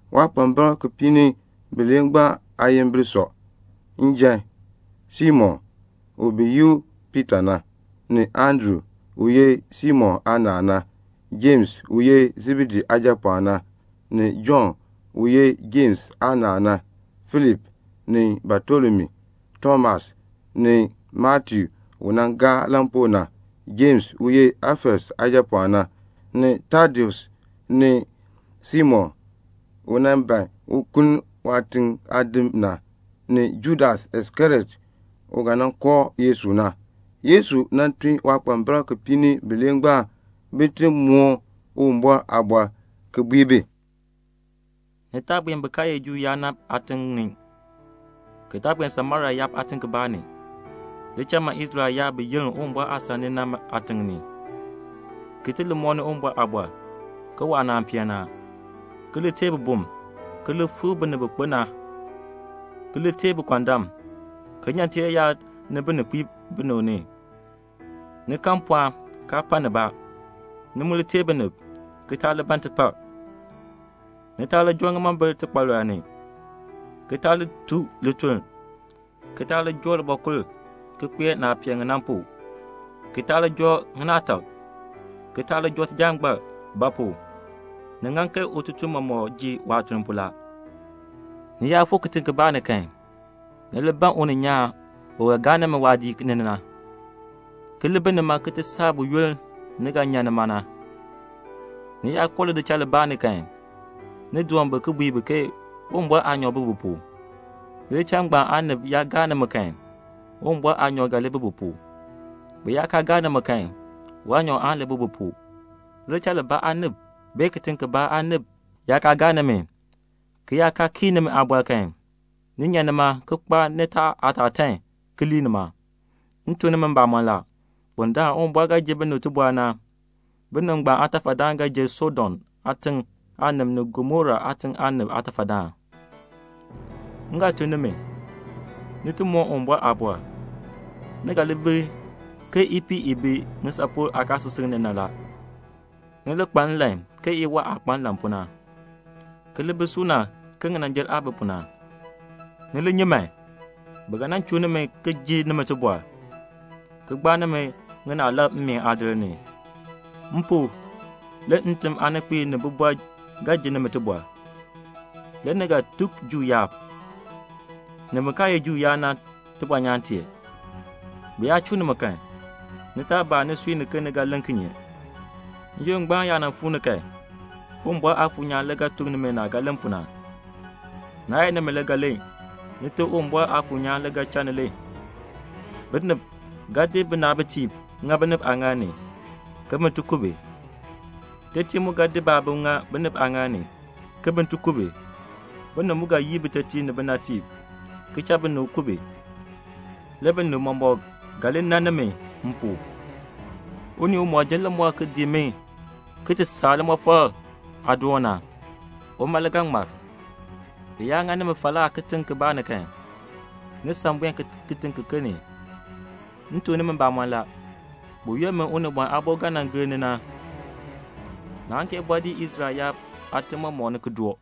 Waakpambalb kipiik ni bilee ngbaan aayimbil sɔ: njan, Simon u bi yi u Piita na, ni Andru u ye Simon aanaal na; Jems u ye Sebedee aajapɔɔn na, ni Jɔnn u ye Jems aanaal na; Filip, ni Batolomiu; Tomas, ni Matiu u nan gaa lampuu na; Jems u ye Alfeus aajapɔɔn na, ni Tadeus; ni Simon u nan ban un kuln waatiŋ aadim na, ni Judas Iskariot u ga nan kooh Yesu na. Le Yesu tun waakpambalb kipiik ni bilee ngbaan bin ti moon Uwumbɔr aaliin le ki bui bi, "Ni taa buen bin kaa ye Juu yaab na aatiŋ ni, ki taa buen Samaria yaab aatiŋ kibaa ni. Li cha man Israel yaab bi yenn Uwumbɔr aasan ni na aatim ni, ki li mooni Uwumbɔr aaliin ke waanaan peen ni a, ki li teei bibum, ki li fikr binib bi kpo na, ki li teei bikɔndam, ki nyan tiyaayar ni bininkpiib binib ni. Ni kan mpɔɔn ngbaan la, kaa pa nibaa. Ni mu li teei binib, ki taa li ban tipar. Ni taa li joo ŋimombil tikpalɔl ni, ki taa li tun lituln, ki taa li joo libɔkul ki kpee naah pee li na pu, ki taa li joo ŋinaatak, ki taa li joo tijangbar; ba pu? ututuln mɔmɔk ŋeer waajikaar la. "Ni yaa fuu kitiŋ kibaa ni kan, ni li ban uninyaan u ga gaa nimi waadiik ni na, ki li bi nima ki ti saa buyoonn ni ga nan nyan nima na. Ni yaa koo lidichal libaa ni kan, ni doon bi ki bui bi ke Uwumbɔr aanyoor bi bi pu. Lidichal ngbaan aanib yaa gaa nimi kan, Uwumbɔr aanyoor ga li bi bi pu. Bi yaa kaa gaa nimi kan, waanyoor aan li bi bi pu. Lidichal aanib, bee kitiŋ aanib yaa kaa gaa nimi kan, ki yaa kaa kii nimi aaliin kan, ni nyan nima ki kpaar nitaa aatatan ki lii nima. M tuk nimi mbamɔn la, bundaln Uwumbɔr ga nan ji binib tibɔr na, binib ngbaan aatafadaan ga li jer Sodom aatiŋ aanib ni Gomora aatiŋ aanib aatafadaan." "M ga tun nimi, ni ti moon Uwumbɔr aaliin. Ni ga li bi ke ipiih i bi ŋisapol aakaasisik ni na la. Ni li kpa nlan ke iwaa aah kpa nlan pu na, ki li bi suuna ke ŋinanjil aah bi pu na. Ni li nyi man. Bi ga nan chuu nimi ki ji nimi tibɔr, ki gbaa nimi ŋinaalab mmeen aadir ni. M pu, le ntim aaninkpiib ni bibɔrb ga ji nimi tibɔr. Le ni ga tuk Juu yaab, ni bin kaa ye Juu yaab na tibɔnyaan tee. Bi yaa chuu nimi kan, ni taa baa nisui ke ni ga len kinye; n-yoonn ngbaan yaa fuu ni kan, Uwumbɔr Aafuur nyaan le ga tuk nimi naah ga len pu na, naa ye nimi le ga len, Nite Uwumbɔr Aafuur nyaan le ga cha ni len. "Binib ga di binaabitiib, ki di ŋa binib aaŋaal ni, ke bin ti ku bi. Tetiib mu ga di baabim, ki di ŋa binib aaŋaal ni, ke bin ti ku bi. Binib mu ga yii bitetiib ni binatiib, ki cha binib ku bi. Le binib mɔmɔk ga li nan nimi m pu. Unii umɔk ji limɔr ki dii mi ki ti saa limɔfal aadoon na, uma le ga ŋmar. Bi yaa ŋa nimi falaa kitiŋ kibaa ni kan, ni san buen kitiŋ kiken ni. M tuk nimi mbamɔn la, buyoonn min Unibɔn Aabo ga nan gir ni na, naan kee bɔɔ dii Israel yaab aatim mɔmɔk ni, ki doo.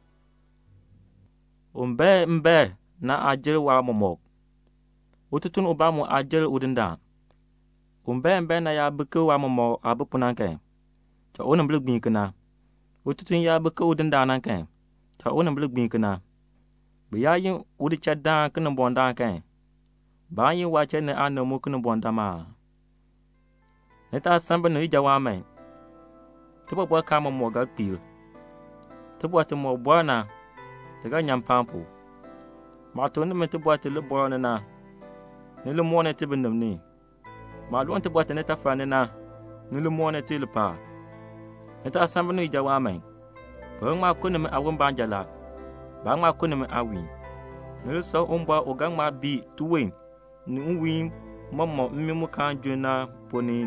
"Un bae mbaen na aa jer waatiicha. Ututuln ubaa mu aa jer udindaan. Un bae mbaen na yaa bi ke waatiicha aah bi pu na kan, cha unimbil gbiin kena. Ututuln yaa bi ke udindaan na kan, cha unimbil gbiin kena. Bi yaa yin udichaldaan Kinimbɔŋ-daan kan, baan yi waachiln ni aanib mu Kinimbɔŋ-daan aa?" "Ni taa san binib ijawaan man. Tibɔbɔrkaan mɔmɔk ga kpiir. Tibɔr timɔk bɔɔ na, ti ga nyan mpaan pu. Maah tuk nimi tibɔr ti libɔɔl ni na, ni li mooni ti nwiihn pu. Maah loo tibɔr ti nitafal ni na, ni li mooni ti mpaan pu. Ni taa san binib ijawaan man. Bi ga ŋma ku nimi aawon baanja. Baan ŋma ku nimi aawiin. Ni li san Uwumbɔr u ga ŋma bii tiwon ni nwiin mɔmɔk na mmii mu kaan junn na ponn ni.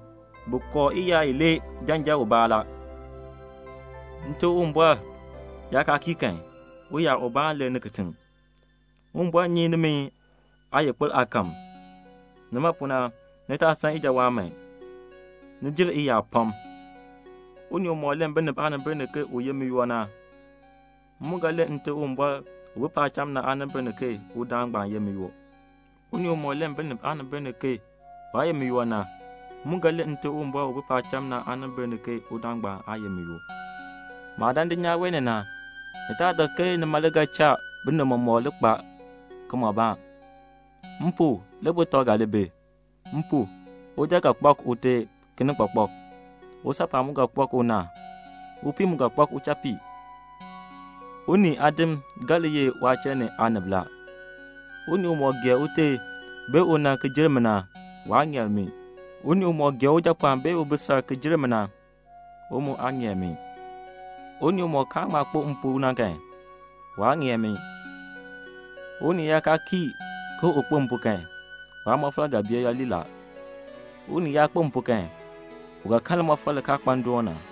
Bi kooh iyaar ilee janjan ubaa la. Nite Uwumbɔr yaa kaa kii kan, uyaar ubaa aan lir kitiŋ. Uwumbɔr nyi nimi aayikpir aakahm. Nima pu na, ni taa san ijawaan man. Ni jer iyaar pam." "Unii umɔk len binib aanimbil ni ke u ye miyoo na, m mu ga len Nte Uwumbɔr u bi paacham na aanimbil ni ke udaan ngbaan le ye miyoo. Unii umɔk len binib aanimbil ni ke waa ye miyoo na, m mu ga len Nte Uwumbɔr u bi paacham na aanimbil ni ke udaan ngbaan aa ye miyoo." "Maah dan dulnyaa wee ni na, ni taa dak ke nima le ga cha binib mɔmɔk li kpaa kimɔbaan. M pu, le butɔb ga li bi. M pu, uja ga kpak ute kinikpakpak, usaapɔɔn mu ga kpak una, upii mu ga kpak uchapii. Unii aadim ga li ye waachiln ni aanib la. "Unii umɔk gee ute bee una ki jer mi na, waa ŋeer mi. Unii umɔk gee ujapɔɔn bee ubisal ki jer mi na, u mu aa ŋeer mi. Unii umɔk kaan ŋma kpo m pu na kan, waa ŋeer mi. "Unii yaa kaa kii ke u kpo m pu kan, waamɔfal ga bee yooli la. Unii yaa kpo m pu kan, u ga kan limɔfal li kaa kpa ndoon na."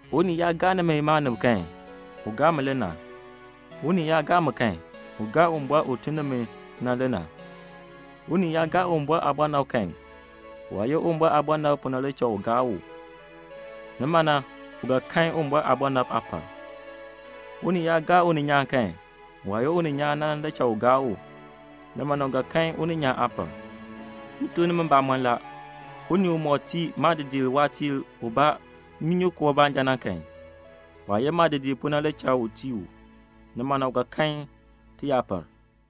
"Unii yaa gaa nimi maanib kan, u gaa mi le na. Unii yaa gaa mi kan, u gaa Uwumbɔr u tun ni mi na le na. Unii yaa gaa Uwumbɔr aabɔnabr kan, waah ye Uwumbɔr aabɔnabr na pu le cha u gaa u, nimana u ga kan Uwumbɔr aabɔnabr aapal. Unii yaa gaa uninyaan kan, waah ye uninyaan na le cha u gaa u, nimana u ga kan uninyaan aapal. M tuk nimi mbamɔn la, unii umɔk tii maadidiir waatiir ubaa nnyunyunkoo baanja na kan, waah ye maadidiir pu na le cha u tii u, nimana u ga kan tiyaapal."